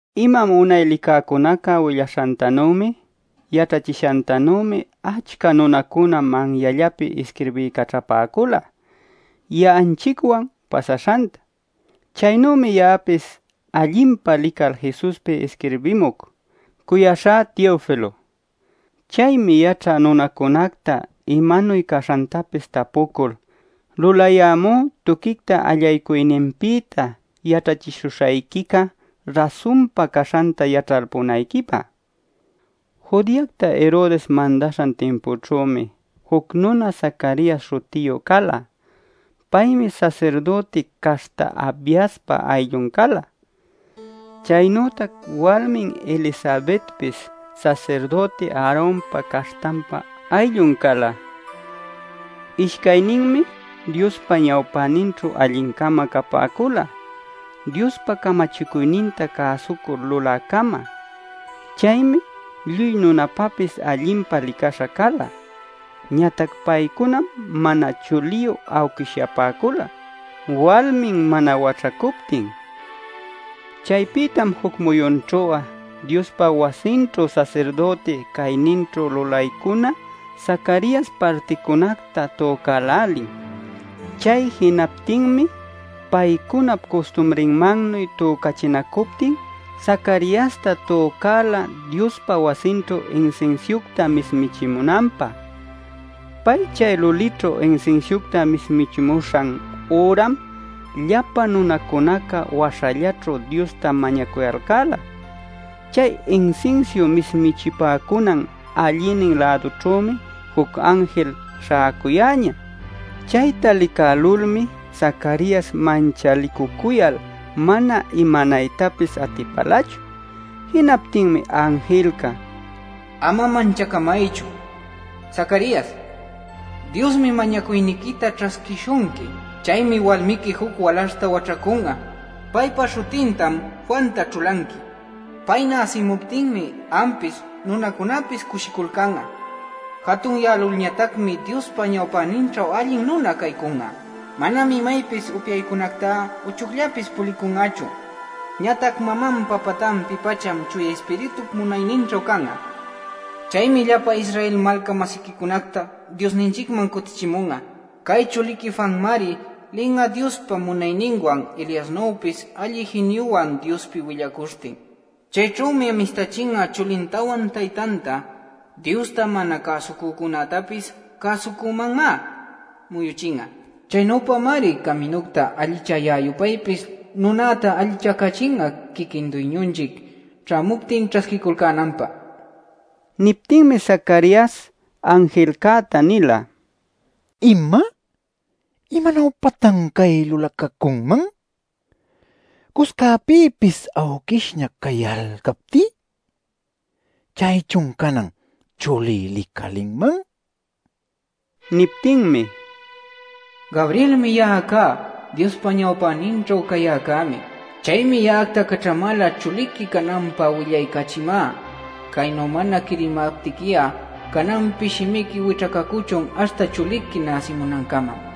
Imam unay licäcunaca willaśhantanümi yaćhachishantanümi achca nunacuna manyallapi isquirbiycaćhapäcula ya'anchicwan pasaśhanta. Chaynümi ya'apis allinpa lical Jesuspi isquirbimuc, cuyaśhá Teofilo. Chaymi yaćhä nunacunacta imanuy caśhantapis tapucul, lulayämú tuquicta allaycuyninpïta yaćhachishuśhayquica rasunpa caśhanta yaćhalpunayquipä. Judeacta Herodes mandaśhan timpućhümi, juc nuna Zacarias śhutiyu cala. Paymi sasirdüti caśhta Abiaspa ayllun cala. Chaynütac walmin Elisabetpis sasirdüti Aaronpa caśhtanpa ayllun cala. Ishcayninmi Diospa ñawpäninćhu alli-cama capäcula, Diospa camachicuyninta cäsucul lulä-cama. Chaymi lluy nunapapis allinpa licaśha cala. Ñatac paycunam mana chuliyu awquishyapäcula, walmin mana waćhacuptin. Chaypïtam juc muyunćhu'a Diospa wasinćhu sasirdüti cayninćhu lulaycuna Zacarias particunacta tücälälin. Chay jinaptinmi paycunap custumrinmannuy tücachinacuptin Zacariasta tücäla Diospa wasinćhu insinsiucta mismichimunanpä. Pay chay lulićhu insinsiucta mismichimuśhan üram llapa nunacunaca waśhallaćhu Diosta mañacuyalcäla. Chay insinsiu mismichipäcunan allïnin-lädućhümi juc anjil śhäcuyäñä. Chayta licälulmi Zacarias manchalicucuyal mana imanaytapis atipälachu. Jinaptinmi anjilca: “Ama manchacamaychu, Zacarias. Diosmi mañacuyniquita ćhasquishunqui. Chaymi walmiqui juc walaśhta waćhacun'a. Paypa śhutintam Juanta ćhulanqui. Pay näsimuptinmi ampis nunacunapis cushiculcan'a. Jatunyälulñatacmi Diospa ñawpäninćhu allin nuna caycun'a. Manam imaypis upyaycunactá uchucllapis pulicun'achu, ñatac mamanpa patanpi-pacham Chuya Ispiritup munayninćhu can'a. Chaymi llapa Israel malca-masiquicunacta Diosninchicman cutichimun'a. Cay chuliqui Juanmari lin'a Diospa munayninwan Eliasnüpis alli jiniyuwan Diospi willacuśhtin. Chayćhümi amistachin'a chulintawan taytanta. Diosta mana cäsucücunätapis cäsucümanmá muyuchin'a. Chaynüpamari caminucta allichayä-yupaypis nunäta allichacachin'a quiquin Duyñunchic ćhämuptin ćhasquiculcänanpä” nil. Niptinmi Zacarias anjilcäta nila: “¿Ima? ¿Imanuypatan cay lulacacunman, cuscäpïpis awquishña cayalcaptí? ¿Chaychun canan chulí licalinman?” nil. Niptinmi: “Gabrielmi ya'a cá; Diospa ñawpäninćhu cayäcämi. Chaymi ya'acta caćhamäla chuliqui cananpä willaycachimä. Caynu mana quirimaptiqui'a cananpi shimiqui wićhacacuchun aśhta chuliqui näsimunancama” nin.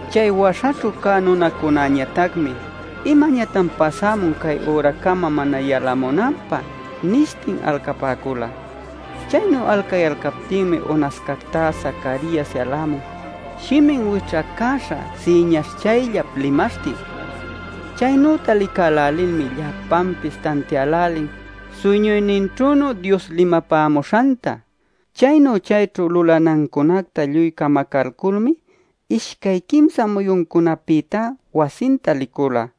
Chay waśhaćhu cä nunacunäñatacmi: “¿Imañatan pasämun cay üracama mana yalamunanpä?” nishtin alcapäcula. Chaynu alcayalcaptinmi unascactá Zacarias yalämun shimin wićhacäśha siñaśhchayllap limaśhtin. Chaynüta licälälilmi llapanpis tantiälälin suyñuyninćhünu Dios limapämuśhanta. Chaynu chayćhu lulanancunacta lluy camacalculmi ishcay quimsa muyuncunapïtá wasinta licula.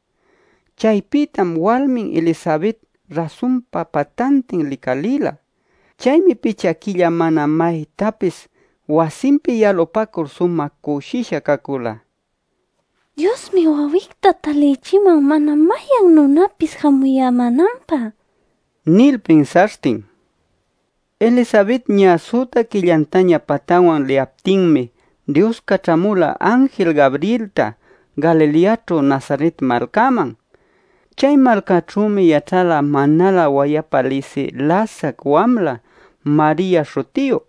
Chaypïtam walmin Elisabet rasunpa patantin licalïla. Chaymi picha quilla mana maytapis wasinpi yalupacul sumä cushisha cacula: “Diosmi wawicta talichiman mana mayan nunapis jamuyämänanpä” nil pinsaśhtin. Elisabet ñä süta quillantaña patanwan liyaptinmi Dios caćhamula anjil Gabrielta Galileaćhu Nazaret malcäman. Chay malcaćhümi yaćhala manalä wayapa lisï lasac wamla Maria śhutiyu.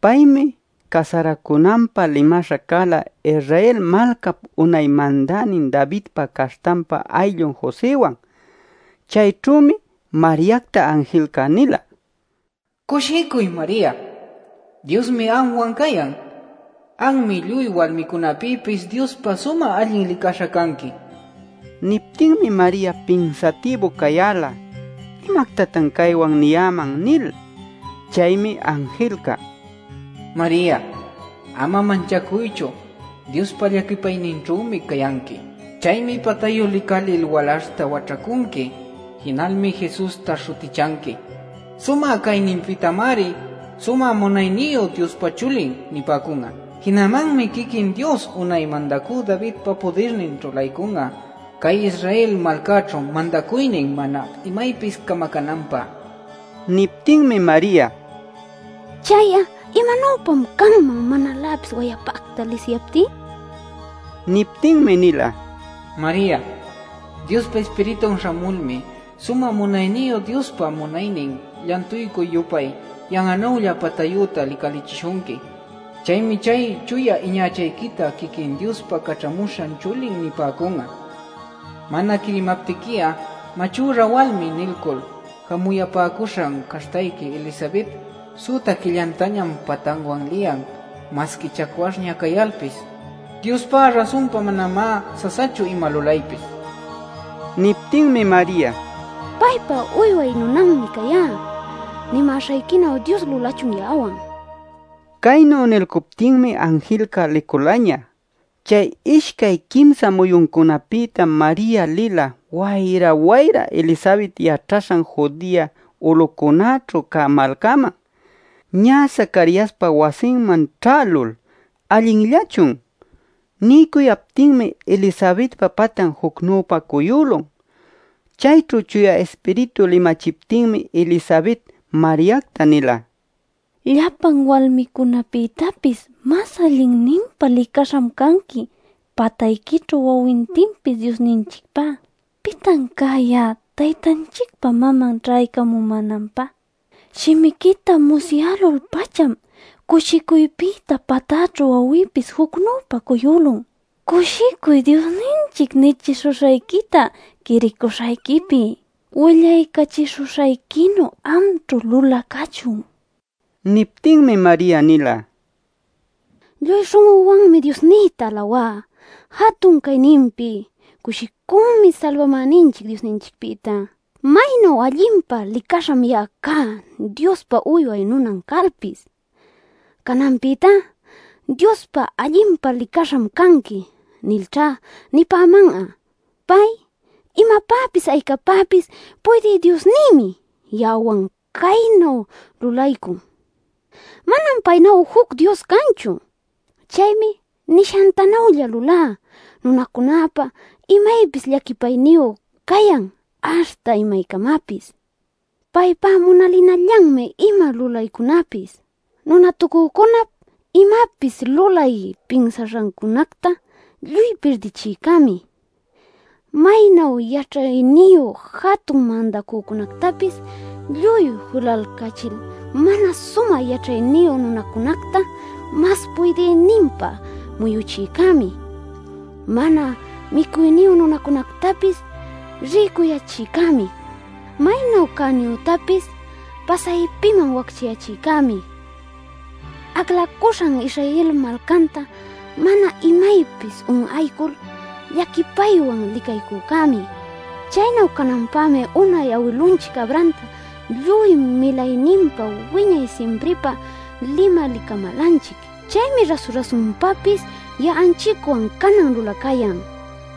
Paymi casaracunanpä limaśha cala Israel malcap unay mandänin Davidpa caśhtanpa ayllun Josëwan. Chayćhümi Mariacta anjilca nila: “Cushicuy, Maria. Diosmi anwan cayan. Anmi lluy walmicunapïpis Diospä sumä allin licaśha canqui” nil. Niptinmi Maria pinsatïbu cayäla “¿Imactatan caywan niyäman?” nil. Chaymi anjilca: “Maria, ama manchacuychu. Diospa llaquipayninćhümi cayanqui. Chaymi patayu licalil walaśhta waćhacunqui. Jinalmi Jesusta śhutichanqui. Sumä cayninpïtamari ‘Sumä Munayniyu Diospa Chulin’ nipäcun'a. Jinamanmi quiquin Dios unay mandacü Davidpa pudirnin ćhulaycun'a cay Israel malcäćhu mandacuynin mana imaypis camacänanpä” nila. Niptinmi Maria: “¿Chay'a imanuypam canman manaläpis wayapacta lisiyaptí?” nila. Niptinmi nila: “Maria, Diospa Ispiritun śhamulmi, Sumä Munayniyu Diospa munaynin llantuycuy-yupay yan'anülla patayüta licalichishunqui. Chaymi chay chuya iñachayquita quiquin Diospa Caćhamuśhan Chulin nipäcun'a. Mana quirimaptiqui'a ‘machüra walmi’ nilcul jamuyapäcuśhan caśhtayqui Elisabetpis süta quillantañam patanwan liyan masqui chacwaśhña cayalpis. Diospá rasunpa, manamá sasachu ima lulaypis” nil. Niptinmi Maria: “Paypa uyway nunanmi cayá. Nimäśhayquinu Dios lulachun ya'awan” nila. Caynu nilcuptinmi anjilca liculaña. Chay ishcay quimsa muyuncunapïtam Maria lila wayra wayra Elisabet yaćhaśhan Judea ulucunäćhu cä malcaman. Ñä Zacariaspa wasinman ćhälul: “allinllachun” niycuyaptinmi Elisabetpa patan jucnüpa cuyülun. Chayćhu Chuya Ispiritu limachiptinmi Elisabet Mariacta nila: “Llapan walmicunapïtapis mas allinninpa licaśham canqui patayquićhu wawintinpis Diosninchicpá” nil. Nishanpïmi: “¿Pitan cá ya'a Taytanchicpa maman ćhaycamumänanpä? Shimiquita musyälul-pacham cushicuypïta patäćhu wawïpis jucnüpa cuyülun. Cushicuy Diosninchic nichishuśhayquita quiricuśhayquipi, willaycachishuśhayquinu amćhu lulacächun” nila. Niptinmi Maria nila: “¡Lluy śhun'üwanmi Diosnïta alawá jatun cayninpi! ¡Cushicümi Salbamäninchic Diosninchicpïta! ¡Maynu allinpa licaśham ya'a cá Diospa uyway nunan cayalpis! Cananpïtá ‘Diospa allinpa licaśham canqui’ nilćha nipäman'a. Pay imapäpis aycapäpis puydï Diosnïmi ya'awan caynu lulaycun. Manam paynu'a juc Dios canchu. Chaymi nishantanülla lulä nunacunäpä imaypis llaquipayniyu cayan aśhta imaycamapis. Paypá munalinallanmi ima lulaycunapis. Nunatucücunap imapis lulay pinsaśhancunacta lluy pirdichïcämi. Maynu yaćhayniyu jatun mandacücunactapis lluy julalcachil mana sumä yaćhayniyu nunacunacta mas puydïninpa muyuchïcämi. Mana micuyniyu nunacunactapis rïcuyächïcämi. Maynu cäniyütapis pasaypiman wacchayächïcämi. Aclacuśhan Israel malcanta mana imaypis un'aycul llaquipaywan licaycücämi. Chaynu cananpämi unay awilunchic Abrahamta lluy milayninpa wiñay simpripä limalicamälanchic. Chaymi rasu-rasunpapis ya'anchicwan canan lulacayan” nila.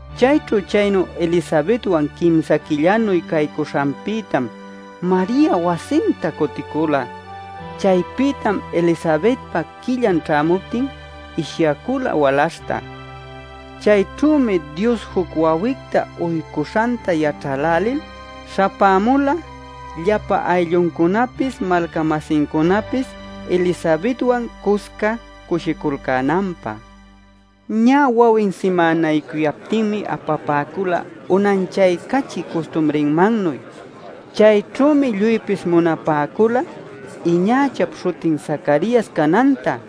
Chayćhu chaynu Elisabetwan quimsa quillanuy caycuśhanpïtam Maria wasinta cuticula. Chaypïtam Elisabetpa quillan ćhämuptin ishyacula walaśhta. Chayćhümi Dios juc wawicta uycuśhanta yaćhälälil śhapämula llapa aylluncunapis malca-masincunapis Elisabetwan cusca cushiculcänanpä. Ñä wawin simänaycuyaptinmi apapäcula unanchaycachï custumrinmannuy. Chayćhümi lluypis munapäcula iñachap śhutin Zacarias cananta.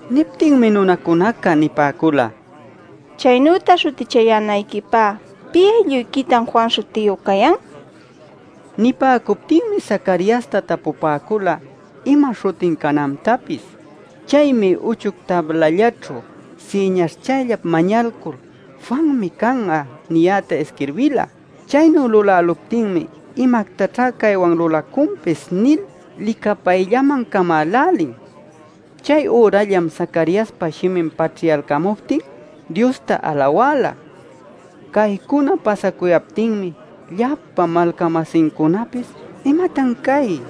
Niptinmi nunacunaca nipäcula: “Chaynüta śhutichayänayquipä ¿pï aylluyquitan Juan śhutiyu cayan?” nil. Nipäcuptinmi Zacariasta tapupäcula, ima śhutin canantapis. Chaymi uchuc tablallaćhu siñaśhchayllap mañalcul “Juanmi can'a” niyäta isquirbila. Chaynu luläluptinmi: “¿Imactaćhá caywan lulacunpis?” nil licapayllaman camälälin. Chay ürallam Zacariaspa shimin paćhyalcamuptin Diosta alawäla. Caycuna pasacuyaptinmi llapa malca-masincunapis: “¿Imatan cay?”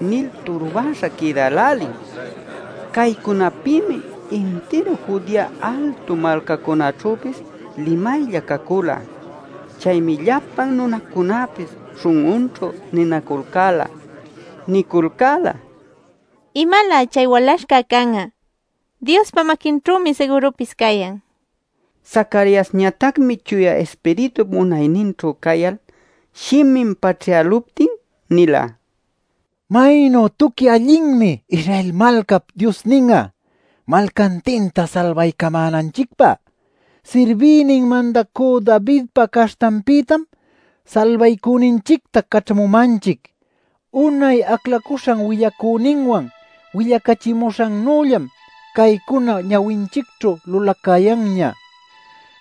nil turbäśha quïdälälin. Caycunapïmi intiru Judea altu malcacunaćhüpis limaylla cacula. Chaymi llapan nunacunäpis śhun'unćhu niculcäla: “¿Imalä chay walaśhca can'a? Diospa maquinćhümi sigürupis cayan” nil. Zacariasñatacmi Chuya Ispiritup munayninćhu cayal shimin paćhyäluptin nila: “¡Maynu tuqui allinmi Israel malcap Diosnin'a malcantinta salbaycamänanchicpä! Sirbïnin mandacü Davidpa caśhtanpïtam salbaycüninchicta caćhamumanchic. Unay aclacuśhan willacüninwan willacachimuśhannüllam caycuna ñawinchicćhu lulacayanña.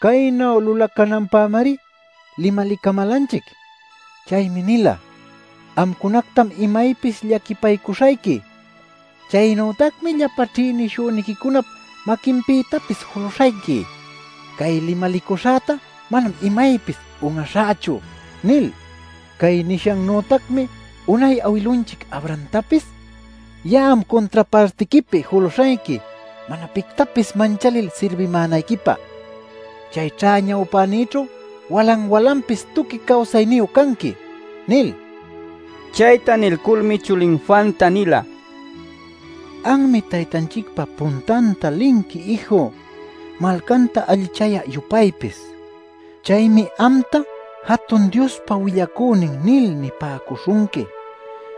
Caynu lulacananpämari limalicamälanchic. Chaymi nila: ‘Amcunactam imaypis llaquipaycuśhayqui. Chaynütacmi llapa ćhïnishüniquicunap maquinpïtapis juluśhayqui. Cay limalicuśhäta manam imaypis un'aśhächu’ nil. Cay nishannütacmi unay awilunchic Abrahamtapis: ‘Ya'am cuntra partiquipi juluśhayqui, mana pictapis manchalil sirbimänayquipä. Chayćha ñawpänïćhu walan-walanpis tuqui cawsayniyu canqui’ nil” nila. Chayta nilculmi chulin Juanta nila: “Anmi Taytanchicpa puntanta linqui, ïju, malcanta allichayä-yupaypis. Chaymi amta ‘Jatun Diospa willacünin’ nil nipäcuśhunqui.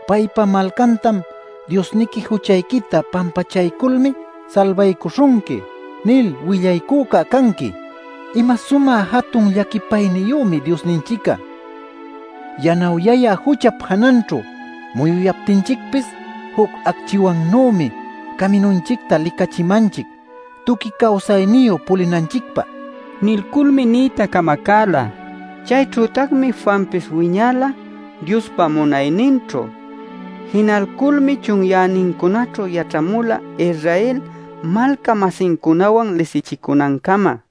Paypa malcantam ‘Diosniqui juchayquita pampachayculmi salbaycuśhunqui’ nil willaycüca canqui. ¡Ima sumä jatun llaquipayniyümi Diosninchic'a! Yanawyayä juchap jananćhu muyuyaptinchicpis juc acchiwannümi caminunchicta licachimanchic tuqui cawsayniyu pulinanchicpä” nilculmi niyta camacäla. Chayćhütacmi Juanpis wiñala Diospa munayninćhu. Jinalculmi chunyänincunaćhu yaćhamula Israel malca-masincunawan lisichicunancama.